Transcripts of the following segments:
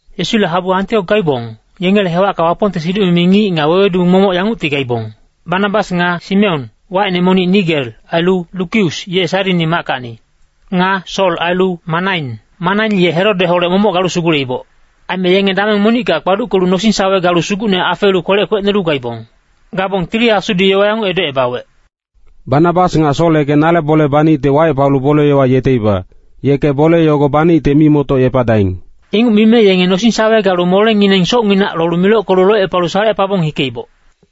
Yesule habu Antiok gaibong, yengele hewacka Wapongte siduc-mimi ngic nga wewedu momoc yangucti gaibong. Banabas nga Simeon, wacine monic Niger, ailu Lukius, ye Sairini mackacni. Nga Sol ailu Manain. Manain ye Herodeholec momoc galu suguleiboc. Aime yenge dameng monicka kpaduckelu nosing-sawe galu Sugucne afeelu kwelec kwecnolu gaibong. Gabong Tili Asudi yowa yanguc edocebawec, “Banabas nga Sol yeke nale bole banicte wacepalu bole-yowa yeteiba, yeke bole yogo banicte mimoctocepadaing.” Inguc mime yenge nosing-sawe galu molengineng socnginac lolu milockelu locepalu salecepabong hikeiboc.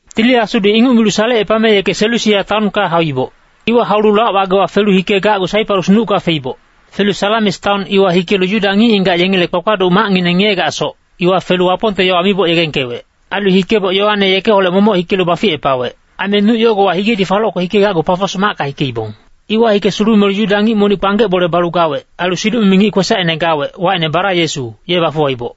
Tili Asudi inguc milu salecepame yeke Selusia taonka hauiboc. Iwa haulu lac-wagewa felu hikegacgu Saiparus nucka feiboc. Felu Salamis taon iwa hikelu Yuda ngic-ngigac yengele kpakpaduc macngineng ngiyegacsoc, iwa felu Wapongte yowa miboc yegengkewec. Ailu hikeboc Yoane yekeholec momoc hikelu baficepawec. Aime nuc yogowa higedi falocke hikegacgu Pafos macka hikeibong. Iwa hike sulumelu Yuda ngic monic kpanggec bole balu gawec, ailu siduc-mimi ngic kwesacine gawec, wacine Bara-Yesu, ye bafuwaiboc.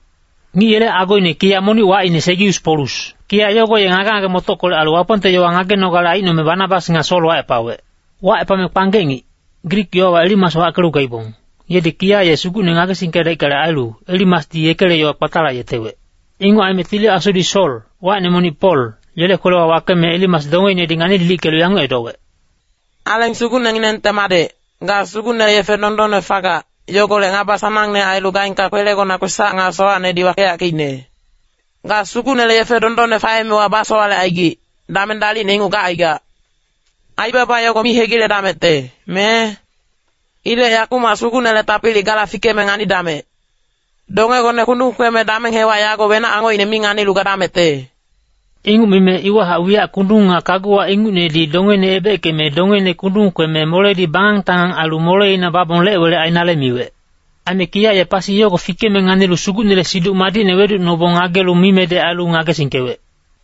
Ngic yele agoine kiya monic wacine Segius Polus. Kiya yogo ye ngage-ngage-motockolec ailu Wapongte yowa ngagenogale aicnome Banabas nga Sol wacepawec. Wacepame kpanggec ngic, Grik yowawa Elimas wackelu gaibong, yedi kiya ye Sugucne ngagesingkedaickale ailu, Elimasdi yekele yowa kpatalayetewec. Inguc aime Tili Asudi Sol, wacine monic Pol, yele kwelewa wakeme Elimas dongeinedi ngani-lilickelu yanguc edowec, “Aleng Sugucnenginengte madec, ga Sugucnele yefe dondonne fagac, yogolec ngaba sanangne ailu gaengka kwelegona kwesac nga sowacnedi wakeyackeicne. Ga Sugucnele yefe dondonne faemewa basowalecaigic, dameng dalicne inguc gacaigac. Aibaba yogo mi hegiledamecte, me? Ilec yakumac Sugucnele tapili gala fikeme nganidamec. Dongegone kundung kweme dameng hewac yago wenac angocine mi nganilu gadamecte.” Inguc mime iwahac wiyac kundung nga kaguwa ingucnedi dongeine ebeckeme dongeine kundung kweme moledi bangang-tangang ailu moleina babong lec-welec ainale miwec. Aime kiya ye pasi yogo fikeme nganilu Sugucnele Siduc Madicne weducnobong ngagelu mimedec ailu ngagesingkewec.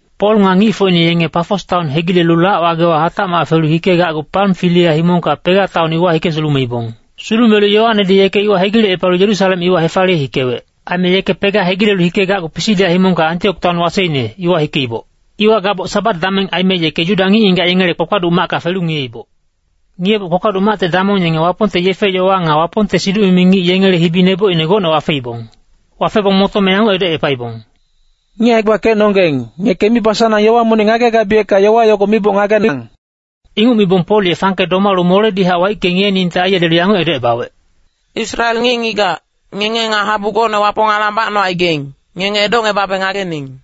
Pol nga ngicfocine yenge Pafos taon hegilelu lac-wagewa hatacmac felu hikegacgu Pamfilia himongka Pega taon iwa hike sulumeibong. Sulumelu Yoanedi yeke iwa hegilecepalu Yerusalem iwa hefaliye hikewec. Aime yeke Pega hegilelu hikegacgu Pisidia himongka Antiok taon waseine, iwa hikeiboc. Iwa gaboc Sabat dameng aime yeke Yuda ngic-ngigac yengele kpakpaduc macka felu ngiyeiboc. Ngiyeboc kpakpaduc macte damong yenge Wapongte yefe-yowa nga Wapongte siduc-mimi ngic yengele hibi nebocine gocne wafeibong. Wafebong motome yanguc edocepaibong, “Ngic hae-gbakecnonggeng, ngeke mibasanang yowa monic ngagegabiyecka yowa yogo miboc ngagening.” Inguc mibong Pol ye fangke domalu moledihac waicke ngiyeningte aiyelelu yanguc edocebawec, “Israel ngic-ngigac, ngenge nga habu gocne Wapong alang bacnocaigaing, ngenge edocngebabe ngagening!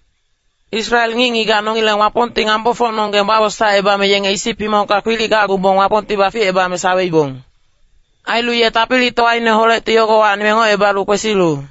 Israel ngic-ngigac nongileng Wapongti ngambofocnonggeng bawosaecebame yenge Isip himongka kwilic gacgubong Wapongti baficebame saweibong. Ailu ye tapilitowaineholecti yogowacni mengocebalu kwesilu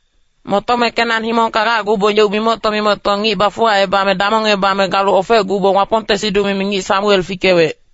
“Motome Kenan himongka gacgubong yeuc mimocto-mimocto ngic bafuwacebame damongebame galu ofecgubong Wapongte siduc-mimi ngic Samuel fikewec.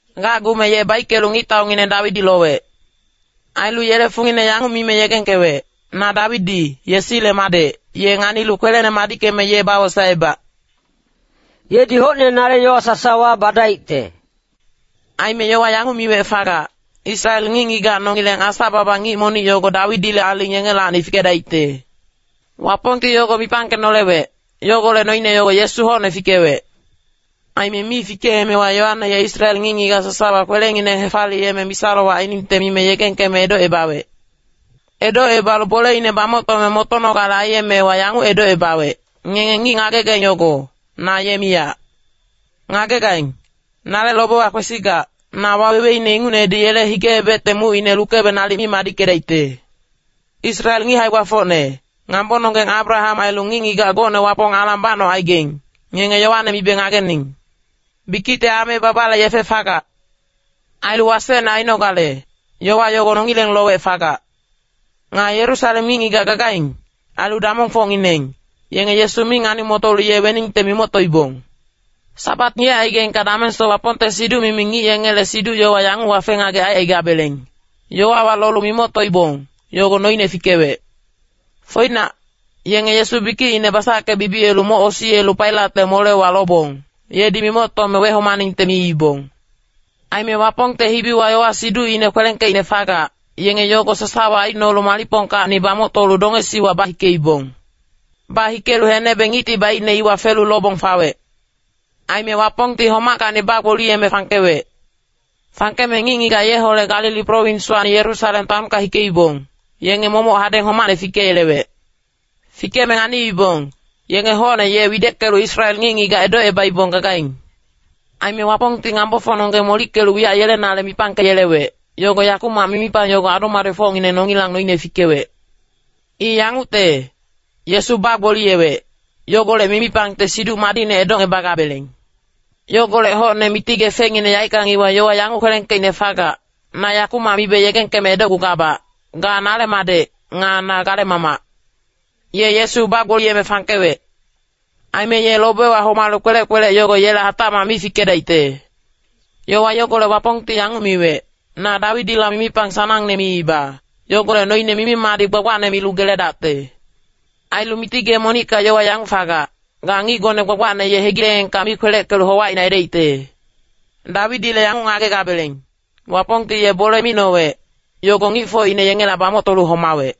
Gacgume ye baickelu ngictaungineng Dawidi lowec. Ailu yele fungine yanguc mime yegengkewec, ‘Na Dawidi, Yesile madec, ye nganilu kwelene madickeme ye bawosaebac. Yedi hocne nale yowa sasawa badaicte.’ “Aime yowa yanguc miwec fagac, ‘Israel ngic-ngigac nongileng Asa-baba ngic monic yogo Dawidile aling yengelacni fikedaicte.’ Wapongti yogo mipangkenolewec, yogolec noine yogo Yesu hocne fikewec. Aime mi fikeemewa Yoane ye Israel ngic-ngigac sasawa kwelengineng hefaliyeme misa-lowac ainingte mime yegengkeme edocebawec. Edocebalu boleine bamoctome motonogale aiyemewa yanguc edocebawec, ‘Ngenge ngic ngagegaing yogo, na ye miyac. Ngagegaing, nale lobewa kwesigac, na waweweine ingucnedi yele hige-ebecte mucine lukebe nalic mi madickedaicte.’ “Israel ngic hae-gbafocne, ngambononggeng Abraham ailu ngic-ngigac gocne Wapong alang bacnocaigaing, ngenge yowane mibe ngagening. Bikicte ame babale yefe fagac. Ailu wasecne ainogale, yowa yogo nongileng lowec fagac. Nga Yerusalem ngic-ngigac gagaing, ailu damongfocngineng, yenge Yesu mi ngani-motolu ye weningte mimoctoibong. Sabat ngiyecaigaingka damengsoc Wapongte siduc-mimi ngic yengele siduc-yowa yanguc wafe-ngagec aicaigabeleng, yowawa lolu mimoctoibong, yogo noine fikewec. Foinac, yenge Yesu bikicine basackebibiyelu moc osiyelu Pailatle molewa lobong, yedi mimoctome wehomaningte miibong. Aime Wapongte hibiwa yowa-siducine kwelengkeicne fagac, yenge yogo sasawa aicnolu malicpongkacni bamoctolu dongesiwa bahikeibong. Bahikelu henebe ngicti baicne iwa felu lobong fawec. Aime Wapongti homackacni bagboliyeme fangkewec. Fangkeme ngic-ngigac yeholec Galili prowinswacni Yerusalem taonka hikeibong, yenge momoc hadeng homacne fikeyelewec. Fikeme nganiibong, yenge hocne ye wideckelu Israel ngic-ngigac edocebaibong gagaing. “Aime Wapongti ngambofocnonggeng molickelu wiyac yelenale mipangkeyelewec, yogo yakumac mimipang yogo adu-madecfocngineng nongilang noine fikewec. I yangucte, Yesu bagboliyewec, yogolec mimipangte Siduc Madicne edocngebagabeleng. Yogolec hocne Miti Gee fengngine yaeckang iwa yowa yanguc kwelengkeicne fagac, ‘Na yakumac mibe yegengkeme edocgugabac, ga nale Madec, nga na gale Mamac.’ Ye Yesu bagboliyeme fangkewec. Aime ye lobewa homalu kpelec-kpelec yogo yela hatacmac mi fikedaicte. Yowa yogolec Wapongti yanguc miwec, ‘Na Dawidila mimipang sanangne miiba, yogolec noine mimi-madic gbagbacne milu geledacte.’ Ailu Miti Gee monicka yowa yanguc fagac, ‘Ga ngicgone gbagbacne ye hegileengka mi kpeleckelu howacine aidaicte.’ “Dawidile yanguc ngagegabeleng, Wapongti ye bole micnowec, yogo ngicfocine yengela bamoctolu homawec.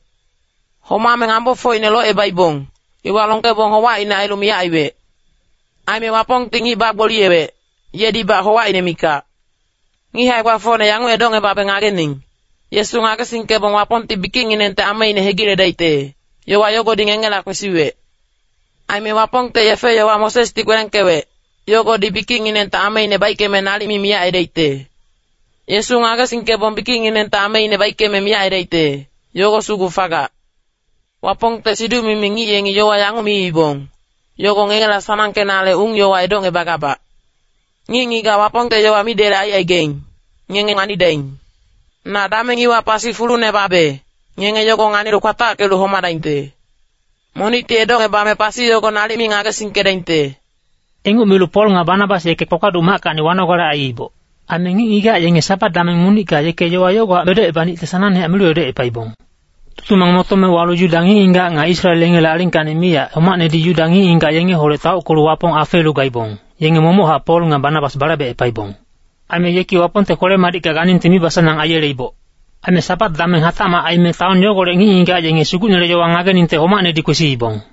Homame ngambofocine locebaibong, iwa longkebong howacine ailu miyac aiwec. Aime Wapongti ngic bagboliyewec, yedibac howacine mikac. “Ngic hae-gbafocne yanguc edocngebabe ngagening, Yesu ngagesingkebong Wapongti bikicnginengte ameine hegiledaicte, yowa yogodi ngengela kwesiwec. Aime Wapongte yefe-yowa Mosesdi kwelengkewec, yogodi bikicnginengte ameine baickeme nalic mi miyac aidaicte. Yesu ngagesingkebong bikicnginengte ameine baickeme miyac aidaicte, yogo sugu fagac. Wapongte siduc-mimi ngic yengi yowa yanguc miibong, yogo ngengela sanangkenale ung-yowa edocngebagabac. ‘Ngic-ngigac Wapongte yowa midelec aicaigaing, ngenge nganidaing. Na dameng iwa pasi fulune babe, ngenge yogo nganilu kwatackelu homadaingte. Monicti edocngebame pasi yogo nalic mi ngagesingkedaingte.’” Inguc milu Pol nga Banabas yeke kpakpaduc mackacni wanogale aiiboc. Aime ngic-ngigac yenge Sabat dameng monicka yeke yowa yogohac edocebanicte sanangne milu edocepaibong. Tutumang motome walu Yuda ngic-ngigac nga Israel yengele alingkacni miyac homacnedi Yuda ngic-ngigac yengeholec taockelu Wapong afeelu gaibong, yenge momochac Pol nga Banabas balaibecepaibong. Aime yeki Wapongte kwele-madicka ganingte mibasanang aiyeleiboc. Aime Sabat dameng hatacmac aime taon yogolec ngic-ngigac yenge Sugucnele yowa ngageningte homacnedi kwesiibong.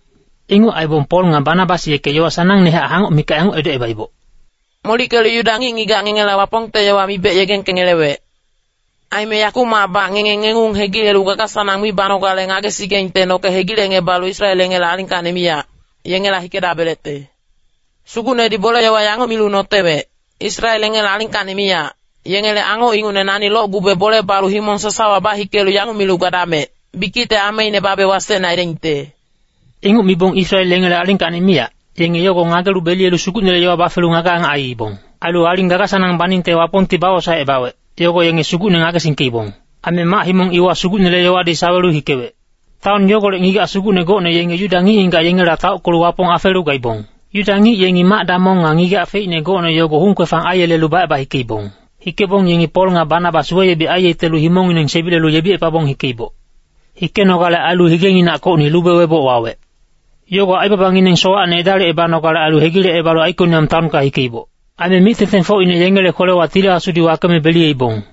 Inguc aibong Pol nga Banabas yeke yowa sanangnehac hangoc mikac yanguc edocebaiboc, “Molickelu Yuda ngic-ngigac ngengela Wapongte yowa mibec yegengkengelewec. Aime yakumacbac ngenge ngengung hegilelu gaga-sanang mi banogale ngagesigaingte noke hegilecngebalu Israel yengele alingkacni miyac, yengela hikedabelecte. Sugucnedi bole-yowa yanguc milu notewec, ‘Israel yengele alingkacni miyac, yengele angoc ingucne nani locgube bole balu himong sasawa bahikelu yanguc milu gadamec, bikicte ameine babe wasecne aidaingte.’” Inguc mibong Israel yengele alingkacni miyac, yenge yogo ngagelu beliyelu Sugucnele yowa bafelu ngage-angac aiibong. Ailu aling gaga-sanang baningte Wapongti bawosaecebawec, yogo yenge Sugucne ngagesingkeibong. Aime mac-himong iwa Sugucnele yowadi sawelu hikewec. Taon yogolec ngigac sugucne gocne yenge Yuda ngic-ngigac yengela taockelu Wapong afeelu gaibong. Yuda ngic yengi mac-damong nga ngigac feicne gocne yogo hung-kwefang aiyelelu baceba hikeibong. Hikebong yengi Pol nga Banabas weyebic aiyetelu himongngineng sebilelu yebicepabong hikeiboc. Hikenogale ailu higenginackocni lube weboc wawec. Yogo aibabangineng sowacne edalicebanogale ailu hegilecebalu Aikoniam taonka hikeiboc. Aime mic-tengtengfocine yengele kwelewa Tili Asudi wakeme beliyeibong.